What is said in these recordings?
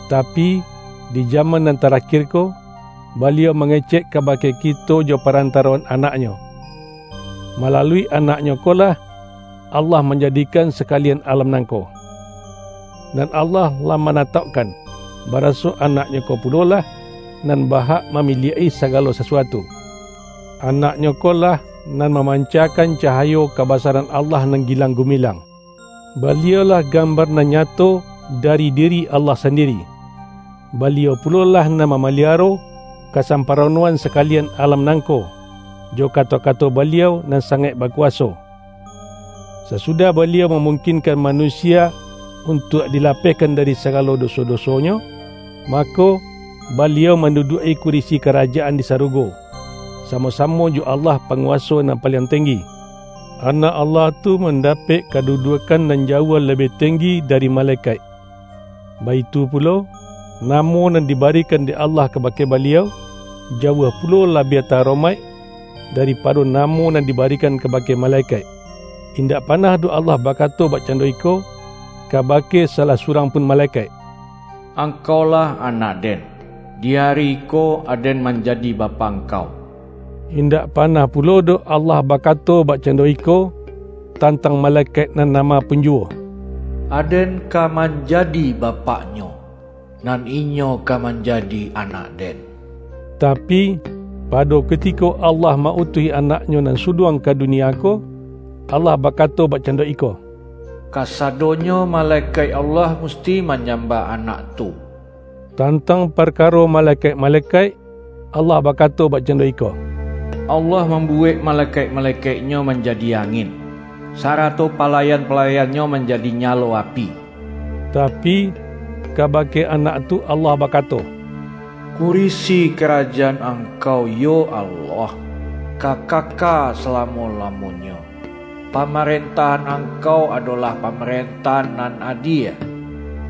Tapi, di jaman nan tarakir ko, Baliau mangecek kaba-ke kito jo parantaroan Anak-Nyo. Ma-lalui Anak-Nyo ko lah, Allah manjadi-kan sakalian alam nangko. Nan Allah lah manataukkan, baraso Anak-Nyo ko pulolah, nan ba-hak mamiliak-i saga-lo sasuatu. Anak-Nyo ko lah, nan ma-mancakan cahayo kabasaran Allah nan gilang-gumilang; Baliau-lah gambar nan nyato dari diri Allah sandiri. Baliau pulolah nan mamaliaro kasamparono-an sakalian alam nangko, jo kato-kato Baliau nan sangaik bakuwaso. Sasudah Baliau mamungkinkan manusia untuak dilapehkan dari sagalo doso-dosonyo, mako, Baliau manduduak-i kurisi Kara-jaan di sarugo, samo-samo jo Allah Pa-nguwaso nan paliang tenggi. Anak Allah tu mandapek kadu-duakkan nan jauah labiah tenggi dari malekaik, baitu pulo, Namo nan diba-rikan dek Allah kabake Baliau, jauah pulo labiah ta-aromaik, daripado na-mo nan dibarikan kabake malekaik. Indak panah doh Allah bakato bak-cando iko, kabake salah surang pun malekaik,”Angkaulah anak-Den; di ari iko, Aden manjadi Bapak angkau.” Indak panah pulo doh Allah bakato bakcando iko, tantang malekaik nan nama pun juwo,”Aden ka manjadi Bapaknyo, nan inyo ka manjadi anak-Den” Tapi, pado kutiko Allah ma-utuih Anak-Nyo nan Suluang ka dunia ko, Allah bakato bakcando iko,”Kasadonyo malekaik Allah musti manyambah Anak tu.” Tantang parkaro malekaik-malekaik, Allah bakato bakcando iko,”Allah mambuwek malekaik-malekaik-Nyo manjadi angin, sarato palayan-palayan-Nyo manjadi nyalo api.” Tapi, kabake Anak tu Allah bakato,”Kurisi Karajaan Angkau, yo Allah, ka kaka salamo-lamonyo! Pamarentahan Angkau adolah pamarentahan nan adie.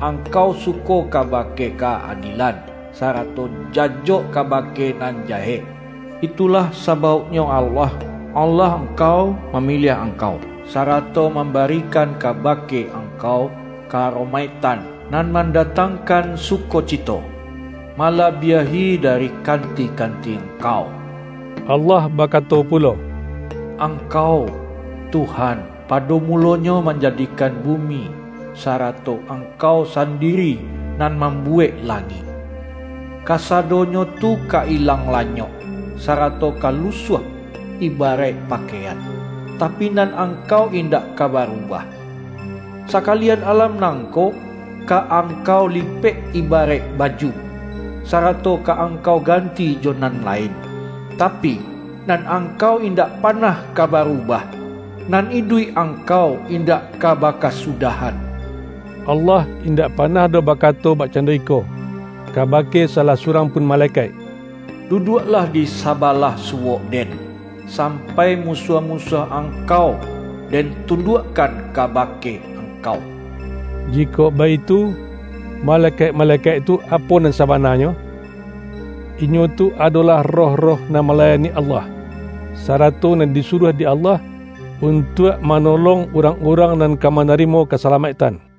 Angkau suko kabake ka-adielan, sarato jajok kabake nan jahek; itulah sabauknyo Allah, Allah Angkau, mamiliah Angkau, sarato mambarikan kabake Angkau ka-aromaiktan nan mandatangkan sukocito, malabiahi dari kanti-kanti Angkau.” Allah bakato pulo,”Angkau, Tuhan, pado mulonyo manjadikan bumi, sarato Angkau sandiri nan mambuwek langik. Kasadonyo tu ka ilang lanyok, sarato ka lusuah ibaraik pakaian; tapi, nan Angkau indak ka barubah. Sakalian alam nangko, ka Angkau lipek ibaraik baju, sarato ka Angkau ganti jo nan lain. Tapi, nan Angkau indak panah ka barubah, nan iduik Angkau, indak ka bakasudahan.” Allah indak panah doh bakato bak-cando iko, kabake salah surang pun malekaik,”Duduaklah di sabalah suwok-Den, sampai musuah-musuah angkau Den tunduakkan kabake angkau.” Jikok baitu, malekaik-malekaik tu apo nan sabananyo? Inyo tu ado-lah roh-roh nan malayani Allah, sa-rato nan disuruah dek Allah, untuak manolong urang-urang nan ka mana-rimo kasalamaiktan.